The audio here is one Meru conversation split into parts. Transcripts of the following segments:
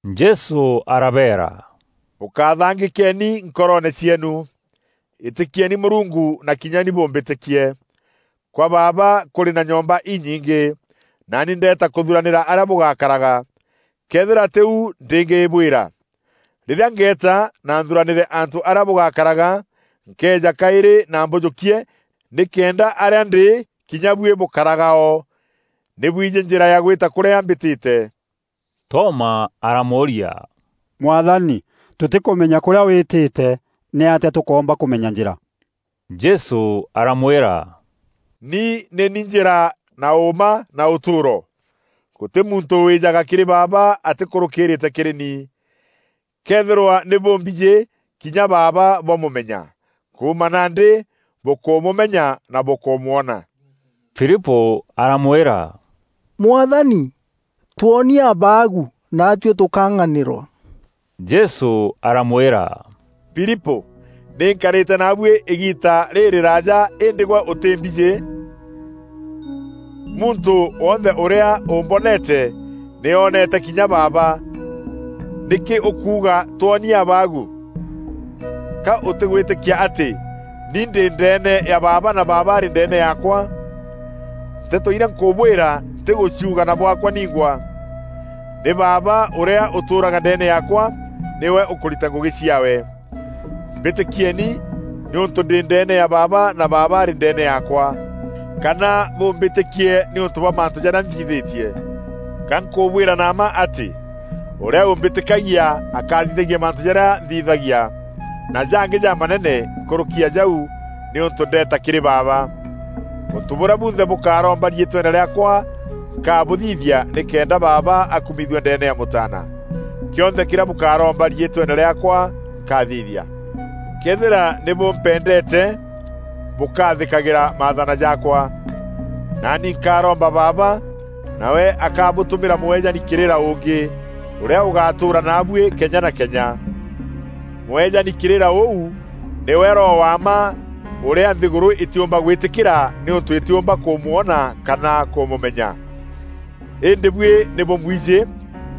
Jesû arabeera, “Bûkathangîkeeni nkoroone cieenu. Îtîkieni Mûrungu na kinya ni bûmbîtîkie. Kwa Baaba kûrî na nyomba inyingî, naani ndeeta kûthuranîra arîa bûgakaraga. Këethîra tî u, ndîngîbwîra. Rîrîa ngeeta na nthuranîre antû arîa bûgakaraga, nkeeja kaîrî na mbûjûkie nîkenda arîa ndî kinya buî bûkaraga o. Nî bwijî njîra ya gwîta kûrîa mbîtîte.” Toma aramûûria, “Mwathani, tûtîkûmenya kûrîa wîtîte. Nîatîa tûkoomba kûmenya njîra?” Jesû aramwîra, “Ni nî ni njîra na ûûma na ûtûûro. Gûtî muntû wîîjaga kîrî Baaba atîkûrûkîîrîte kîrî ni. Këethîrwa nî bûmbijî, kinya Baaba bwamûmenya. Kuuma nandî bûkûmûmenya na bûkûmwona.” Filipû aramwîra, “Mwathani, twonie Abaagu, naatuî tûkang'anîrwa.” Jesû aramwîra, “Filipû, nî nkarîte naabuî îgiita rîrîraaja îndî gwe ûtîmbijî? Muntû wonthe ûrîa ûmboneete, nî ooneete kinya Baaba. Nîkî ûkuuga, ‘Twonie Abaagu?’ Ka ûtîgwîtîkia atî ni ndî ndeene ya Baaba na Baaba arî ndeene yaakwa? Nteto irîa nkûbwîra ntîgûciuga na bwaakwa ningwa. Nî Baaba ûrîa ûtûûraga ndeene yaakwa nîwe ûkûrita ngûgî ciaawe. Mbîtîkieeni nîûntû ndî ndeene ya Baaba na Baaba arî ndeene yaakwa, kana bûmbîtîkie nîûntû bwa mantû jarîa nthithîtie. Ga nkûbwîra na mma atî, ûrîa ûmbîtîkagia akathithagia mantû jarîa nthithagia, na jangî jamanene nkûrûki ya jau nîûntû ndeeta kîrî Baaba. Ûntû bûrîa bûnthe bûkaromba riîtweene rîaakwa nkabûthithia nîkenda Baaba akumithua ndeene ya Mûtaana. Kîonthe kîrîa bûkaromba riîtweene rîaakwa, nkathithia. “Këethîra nî bûmpendeete, bûkathîkagîra maathana jaakwa. Naani nkaaromba Baaba, nawe akabûtûmîra Mûeejani kîrîra ûngî, ûrîa ûgatûûra naabuî kenya na kenya. Mûeejani kîrîra ûu nîwe Roho wa mma ûrîa nthîgûrû îtîûmba gwîtîkîra nîûntû îtîûmba kûmwona kana kûmûmenya. Îndî buî nî bûmwijî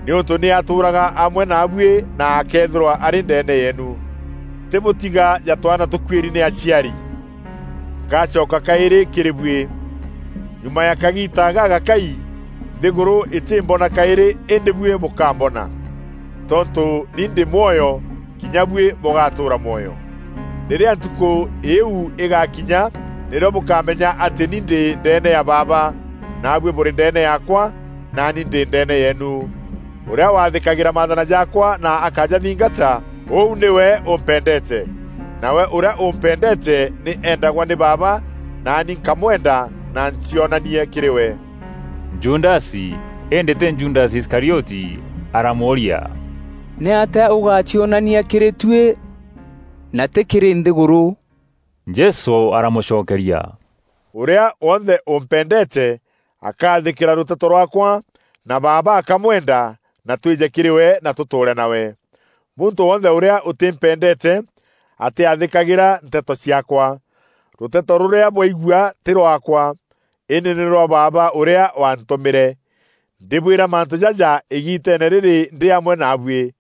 nîûntû nî atûûraga amwe naabuî na akeethîrwa arî ndeene yeenu. “Ntîbûtiga ja twaana tûkuîri nî aciari, ngacoka kaîrî kîrî buî. Nyuma ya kagiita gagakai, nthîgûrû îtîmbona kaîrî îndî buî bûkamboona. Tontû ni ndî mwoyo, kinya buî bûgatûûra mwoyo. Rîrîa ntukû îîu îgaakinya nîrîo bûkamenya atî ni ndî ndeene ya Baaba, naabuî bûrî ndeene yaakwa, naani ndî ndeene yeenu. Ûrîa waathîkagîra maathana jaakwa na akajathingata, ûu nîwe ûmpendeete. Nawe ûrîa ûmpendeete nî eendagwa nî Baaba, naani nkamwenda, na ncionanie kîrî we.” Judasi, îndî tî Judasi Iskarioti, aramûûria, “Nîatîa ûgaacionania kîrî tuî na tî kîrî nthîgûrû?” Jesû aramûcokeria, “Ûrîa wonthe ûmpendeete akaathîkîra rûteto rwaakwa na Baaba akamwenda na twîje kîrî we na tûtûûre nawe. Muntû wonthe ûrîa ûtîmpendeete atîathîkagîra nteto ciaakwa. Rûteto rûrîa bwaigua tî rwaakwa, îndî nî rwa Baaba ûrîa waantûmîre. “Ndîbwîra mantû jaja îgiiteene rîrî ndî amwe naabuî.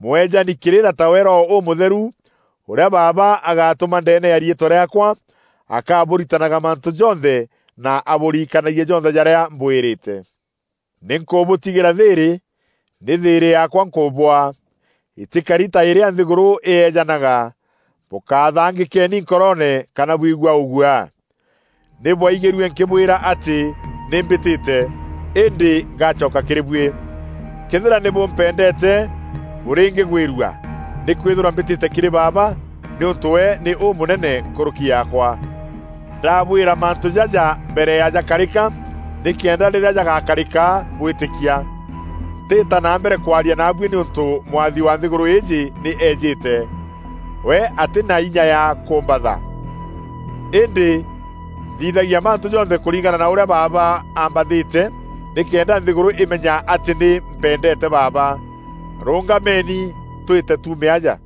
Mûeejani kîrîra tawe Roho Ûmûtheru, ûrîa Baaba agaatûma ndeene ya riîtwa rîaakwa, akaabûritanaga mantû jonthe na abûririkanagie jonthe jarîa mbwîrîte. “Nî nkûbûtigîra thîîrî, nî thîîrî yaakwa nkûbûaa. Îtîkari ta îrîa nthîgûrû îeejanaga. Bûkathangîkeeni nkoroone kana bwigua ûguaa. Nî bwaigîrue nkîbwîra atî ‘Nî mbîtîte, îndî ngacoka kîrî buî.’ Këethîra nî bûmpendeete bûrîngîgwîrua, nîkwîthîrwa mbîtîte kîrî Baaba, nîûntû we nî ûmûnene nkûrûki yaakwa. Ndabwîra mantû jaja mbere ya jakarîka nîkenda rîrîa jagakarîka bwîtîkia. Ntîîta na mbere kwaria naabuî nîûntû mwathi wa nthîgûrû îîjî nî eejîte. We atî na inya ya kûmbatha. Îndî nthithagia mantû jonthe kûringana na ûrîa Baaba ambathîte nîkenda nthîgûrû îmenya atî nî mpendeete Baaba. Rûngameni, twîte tuume aja!”